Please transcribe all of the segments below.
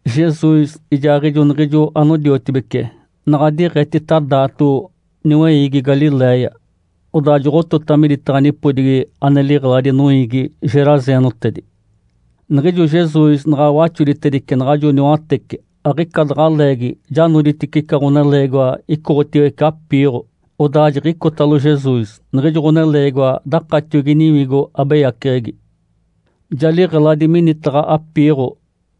Jesus ijaaɡ̶ijo niɡ̶ijo anodiotibece naɡ̶a diɡ̶etita daato niweiigi Galiléia, odaa joɡ̶otota miditaɡ̶a nipodigi ane liɡ̶eladi noiigi geraseenotedi. Niɡ̶ijo Jesus naɡ̶a waxoditedice naɡ̶ajo niwatece, aɡ̶ica daɡ̶a leegi ja noditice ica ɡ̶oneleegiwa icoɡ̶otiwece apiiɡ̶o, odaa jiɡ̶icotalo Jesus. Niɡ̶ijo ɡ̶oneleegiwa dakatiogi niwigo abeyaceɡ̶egi. Ja liɡ̶eladi minitaɡ̶a apiiɡ̶o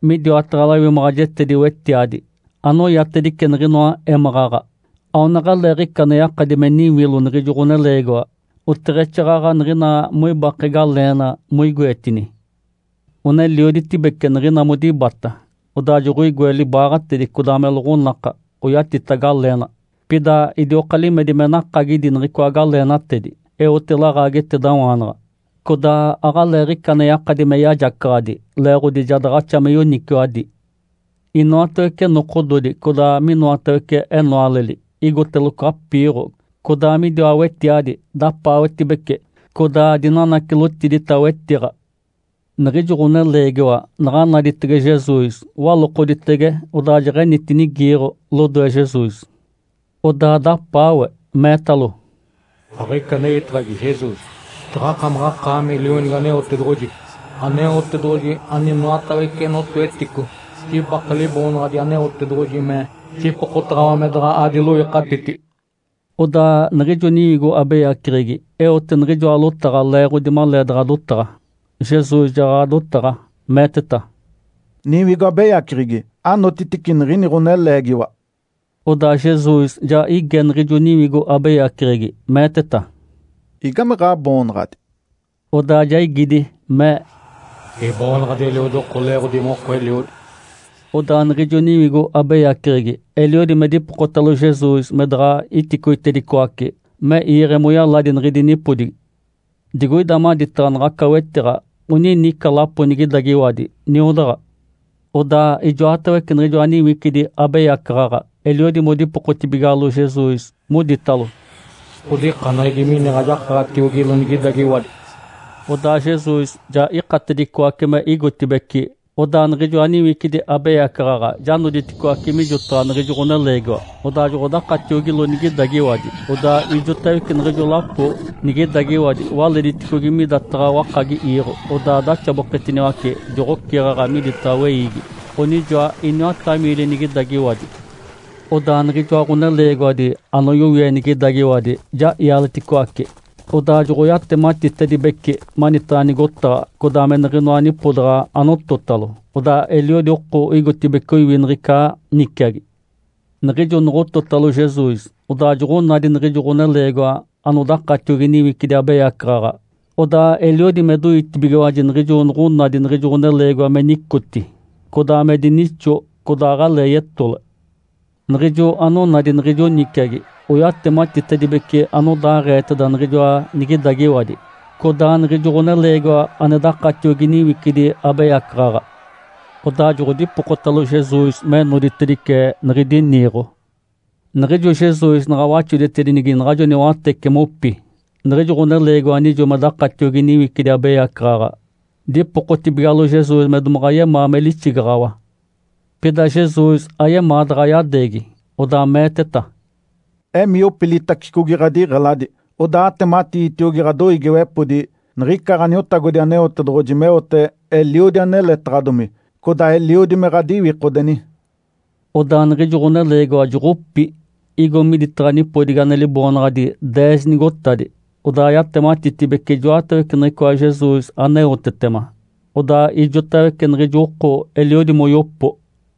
midiwataɡ̶a lawimaɡ̶ajetedi-wetiadi anoyatedice niɡ̶inoa émaɡ̶aɡ̶a. Aonaɡ̶aleeɡ̶ica ane yakadi me niwilo niɡ̶ijo ɡ̶oneleegiwa, oteɡ̶exaaɡ̶aɡ̶a niɡ̶ina moibake galeena moigoetini. Onelioditibece niɡ̶ina modibata, odaa joɡ̶oigoe libaaɡ̶atedi, codaa me loɡ̶onaka oyatita galeena, pida idioka limedi me nakagidi niɡ̶icoa galeenatedi, eote laɡ̶aagetedawaanaɡ̶a. Codaa aɡ̶aleeɡ̶ica ane yakadi me yajacaɡ̶adi, leeɡ̶odi ja daɡ̶axa me yoniciwadi. Inoatawece nokododi codaa minoatawece enoaleli igoteloco apiiɡ̶o codaa midiwa wetiadi, dapaawetibece, codaa dinanacilotidita wetiɡ̶a. Niɡ̶ijo ɡ̶oneleegiwa naɡ̶a naditege Jesus, walokoditege, odaa jeɡ̶enitinigiiɡ̶o lodoe Jesus. Odaa dapaawe, meetalo, “Aɡ̶ica anejitaɡ̶agi, Jesus. Jaɡ̶akamaɡ̶akaami Lionigi Aneotedoɡ̶oji, Aneotedoɡ̶oji aninoatawece notoetico. Jibake Liboonaɡ̶adi Aneotedoɡ̶oji me jipokotaɡ̶awa me daɡ̶a adiloikatiti.” Odaa niɡ̶ijo niwigo abeyaceɡ̶egi eote niɡ̶ijoa lotaɡ̶a leeɡ̶odi maleedaɡ̶a dotaɡ̶a, Jesus jaɡ̶aɡ̶a dotaɡ̶a, meeteta, “Niwigo abeyaceɡ̶egi, anotitice niɡ̶ini ɡ̶oneleegiwa!” Odaa Jesus ja ige niɡ̶ijo niwigo abeyaceɡ̶egi, meeteta, “Igame ɡ̶aboonaɡ̶adi?” Odaa ja igidi, mee, “Iboonaɡ̶adi ‘Eliodi oko’! Leeɡ̶odi moko eliodi.” Odaa niɡ̶ijo niwigo abeyaceɡ̶egi eliodi me dipokotalo Jesus me daɡ̶a iticoitedicoace me iiɡ̶e moyaladi niɡ̶idi nipodigi. Digoida maditaɡ̶a naɡ̶aca wetiɡ̶a onini ica lapo nigidagiwadi, niodaɡ̶a. Odaa ijoatawece niɡ̶ijoa niwicidi abeyacaɡ̶aɡ̶a eliodi modipokotibigalo Jesus, moditalo, “Ǥodikaneɡ̶egi me iniɡ̶a jakaɡ̶atiogilo nigidagiwadi.” Odaa Jesus ja ikatedicoace me igotibeci, odaa niɡ̶ijoa niwicidi abeyacaɡ̶aɡ̶a ja noditicoaci mijotaɡ̶a niɡ̶ijo ɡ̶oneleegiwa, odaa joɡ̶odakatiogilo nigidagiwadi. Odaa ijotawece niɡ̶ijo lapo nigidagiwadi walediticogi midataɡ̶a wakagi iiɡ̶o, odaa daxaboketiniwace, joɡ̶oceɡ̶aɡ̶a miditaɡ̶a weiigi. Onijoa iniwata miili nigidagiwadi. Odaa niɡ̶ijoa ɡ̶oneleegiwadi anoyowie nigidagiwadi ja ialeticoace. Odaa joɡ̶oyatematitedibece manitaɡ̶a nigotaɡ̶a, codaa me niɡ̶inoa nipodaɡ̶a anototalo. Odaa eliodi oko igotibeci oiwi niɡ̶ica niciagi. Niɡ̶ijo noɡ̶ototalo Jesus, odaa joɡ̶onadi niɡ̶ijo ɡ̶oneleegiwa anodakatiogi niwicidi abeyacaɡ̶aɡ̶a. Odaa eliodi me doitibigiwaji niɡ̶ijo noɡ̶onadi niɡ̶ijo ɡ̶oneleegiwa me nicoti, codaa me dinixo, codaa aɡ̶alee yetole. Niɡ̶ijo anonadi niɡ̶ijo niciagi oyatematitedibece anodaaɡ̶eeteda niɡ̶ijoa nigidagiwadi, codaa niɡ̶ijo ɡ̶oneleegiwa ane dakatiogi niwicidi abeyacaɡ̶aɡ̶a. Odaa joɡ̶odipokotalo Jesus me noditedice niɡ̶idi niiɡ̶o. Niɡ̶ijo Jesus naɡ̶a waxoditedinigi naɡ̶ajo niwatece mopi, niɡ̶ijo ɡ̶oneleegiwa anijo modakatiogi niwicidi abeyacaɡ̶aɡ̶a dipokotibigalo Jesus me domaɡ̶a yemaa me lixigaɡ̶awa. Pida Jesus ayemaa daɡ̶a yadeegi, odaa meeteta, “Emii, opilitacicogi ɡ̶adiɡ̶eladi, odaa atematiitiogi ɡ̶adoiigiwepodi niɡ̶ica Ǥaniotagodi Aneotedoɡ̶oji meote eliodi aneletaɡ̶adomi, codaa eliodi me ɡ̶adiwikodeni.” Odaa niɡ̶ijo ɡ̶oneleegiwa joɡ̶opi, igo miditaɡ̶a nipodigi ane liboonaɡ̶adi “Deez nigotadi”, odaa yatematitibece ijoatawece niɡ̶icoa Jesus aneotetema. Odaa ijotawece niɡ̶ijo oko eliodi moyopo.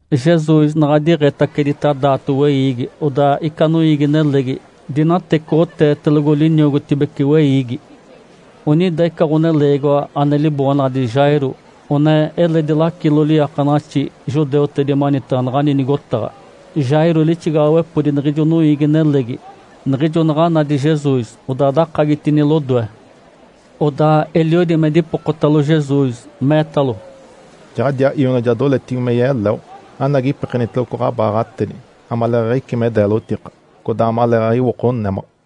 Jesus naɡ̶a diɡ̶etacedita daato weiigi. Odaa ica noiigi-nelegi dinatecoɡ̶oteetelogo liniogotibece weiigi. Onida ica ɡ̶oneleegiwa ane liboonaɡ̶adi Jairo one eledi lacilo liiakanaɡ̶axi judeutedi manitaɡ̶a naɡ̶ani nigotaɡ̶a. Jairo lixigaɡ̶awepodi niɡ̶ijo noiigi-nelegi. Niɡ̶ijo naɡ̶a nadi Jesus, odaa dakagitini lodoe. Odaa eliodi me dipokotalo Jesus, meetalo, “Jaɡ̶adiaa ionawaana ja doletibige me yeleo. Anagi, ipekeniteloco ɡ̶abaaɡ̶atedi amaleeɡ̶aɡ̶a icí me deelotika, codaa amaleeɡ̶aɡ̶a iwoko némaɡ̶a!”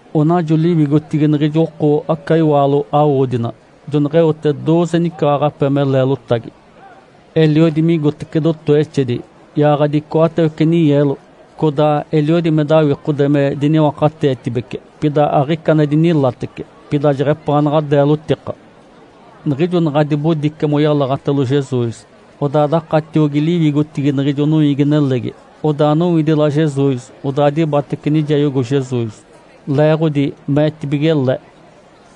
Onajo liwigotigi niɡ̶ijo oko aca iwaalo awodina. Joneɡ̶eote dooze nicaaɡ̶ape me leelotagi. Eliodi migotece dotowexedi, yaaɡ̶adi icoatawece ninyeelo. Codaa eliodi me dawikode me diniwakateetibece, pida aɡ̶ica ane dinilatece, pida jeɡ̶epaanaɡ̶a deelotika. Niɡ̶ijo naɡ̶a dibodice moyalaɡ̶atalo Jesus, odaa dakatiogi liwigotigi niɡ̶ijo noiigi-nelegi, odaa nowidila Jesus, odaa dibatece nijayogo Jesus. Leeɡ̶odi meetibige le,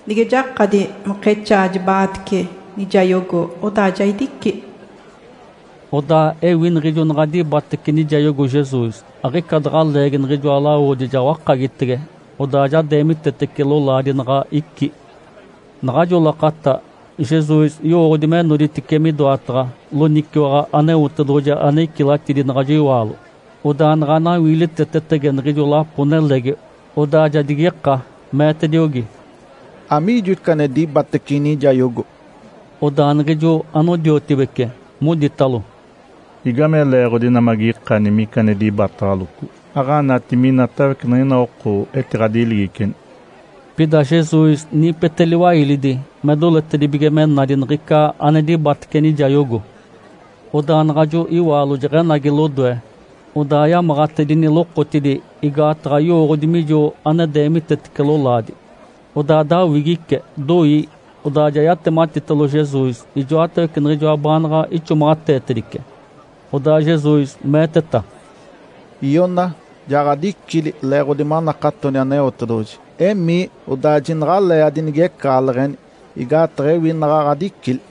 “Nige jakadi mokexaa jiba-aatece nijayogo, odaa ja idici.” Odaa ewi niɡ̶ijo naɡ̶a dibatece nijayogo Jesus, aɡ̶ica daɡ̶a leegi niɡ̶ijoa lawodi ja wakagitege, odaa ja deemitetece lolaadi naɡ̶a icí. Naɡ̶ajo lakata Jesus yowooɡ̶odi me noditice midoataɡ̶a loniciwaɡ̶a Aneotedoɡ̶oji ane icilatidi naɡ̶ajo iwaalo, odaa naɡ̶a nawiilitetetege niɡ̶ijo lapo-nelegi, odaa ja digika, meetediogi, “Amiijo ica ane dibatece inijayogo?” Odaa niɡ̶ijo anodiotibece moditalo, “Igame leeɡ̶odi ina magikani mica ane dibataɡ̶aloco, aɡ̶anati minatawece niɡ̶ina oko etiɡ̶adiligiceni?” Pida Jesus niipete liwailidi me doletedibige me nadi niɡ̶ica ane dibatece nijayogo. Odaa naɡ̶ajo iwaalo jeɡ̶enagi lodoe, odaa yamaɡ̶atedini lokotidi, igaataɡ̶a yowooɡ̶odi mijo ane deemitetece lolaadi. Odaa dawigice, doi, odaa ja yatematitalo Jesus ijoatawece niɡ̶ijoa baanaɡ̶a ixomaɡ̶ateetedice. Odaa Jesus meeteta, “Iona, ja ɡ̶adicili leeɡ̶odi manakatoni Aneotedoɡ̶oji. Emii, odaa jinaɡ̶alee adinigecaɡ̶aleɡ̶eni. Igaataɡ̶a ewi naɡ̶a ɡ̶adicili.”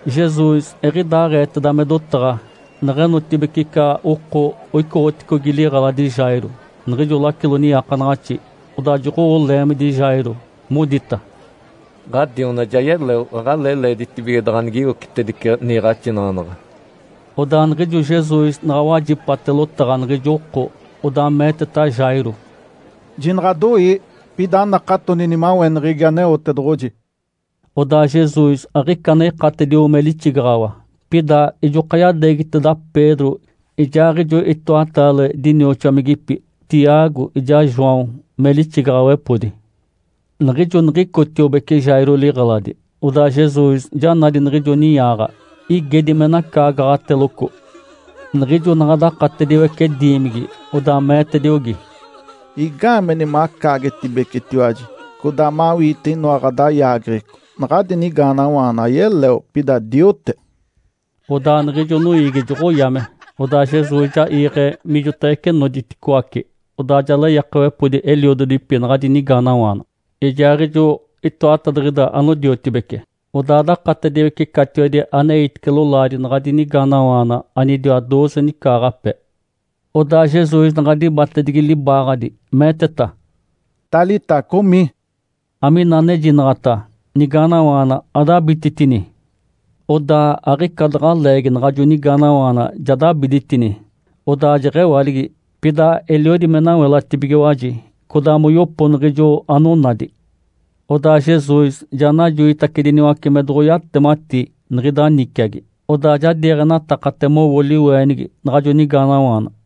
Jesus eɡ̶idaaɡ̶eeteda me dotaɡ̶a neɡ̶enotibeci ica oko oicoɡ̶oticogi liɡ̶eladi Jairo, niɡ̶ijo lacilo niiakanaɡ̶axi. Odaa joɡ̶owo leemidi Jairo, modita, “Ǥadiona ja yeleo. Aɡ̶alee leeditibige daɡ̶a anigiwocitedice niiɡ̶axinaɡ̶anaɡ̶a.” Odaa niɡ̶ijo Jesus naɡ̶a wajipate lotaɡ̶a niɡ̶ijo oko, odaa meeteta Jairo, “Jinaɡ̶adoii, pida anakatoni nimaweneɡ̶egi Aneotedoɡ̶oji.” Odaa Jesus aɡ̶ica ane ikatedio me lixigaɡ̶awa, pida ijoka yadeegiteda Pedro, ijaaɡ̶ijo itoataale dinioxomigipi Tiago ijaa João me lixigaɡ̶awepodi. Niɡ̶ijo niɡ̶icotiobeci Jairo liɡ̶eladi, odaa Jesus ja nadi niɡ̶ijo ninyaaɡ̶a, igedi me nacaagaɡ̶ateloco. Niɡ̶ijo naɡ̶a dakatediwece diimigi, odaa meetediogi, “Igaameni macaagetibecetiwaji, codaa mawiite inoa ɡ̶adayaageɡ̶eco? Naɡ̶adi nigaanawaana ayeleo, pida diote.” Odaa niɡ̶ijo noiigi joɡ̶oyame. Odaa Jesus ja iiɡ̶e mijotawece noditicoaci. Odaa ja leyakawepodi eliododipi naɡ̶adi nigaanawaana, ijaaɡ̶ijo itoatadiɡ̶ida anodiotibece, odaa dakatediwece catiwedi aneitice lolaadi naɡ̶adi nigaanawaana, anidiwa dooze nicaaɡ̶ape. Odaa Jesus naɡ̶a dibatedigi libaaɡ̶adi, meeteta, “Talitá cumi!” amina anejinaɡ̶ata “Nigaanawaana, adabititini!” Odaa aɡ̶ica daɡ̶a leegi naɡ̶ajo nigaanawaana ja dabiditini, odaa jeɡ̶ewaligi. Pida eliodi me nawelatibigiwaji, codaa moyopo niɡ̶ijo anonadi. Odaa Jesus ja najoitacediniwace me doɡ̶oyatemati niɡ̶ida niciagi. Odaa ja diiɡ̶enatakate mowo liweenigi naɡ̶ajo nigaanawaana.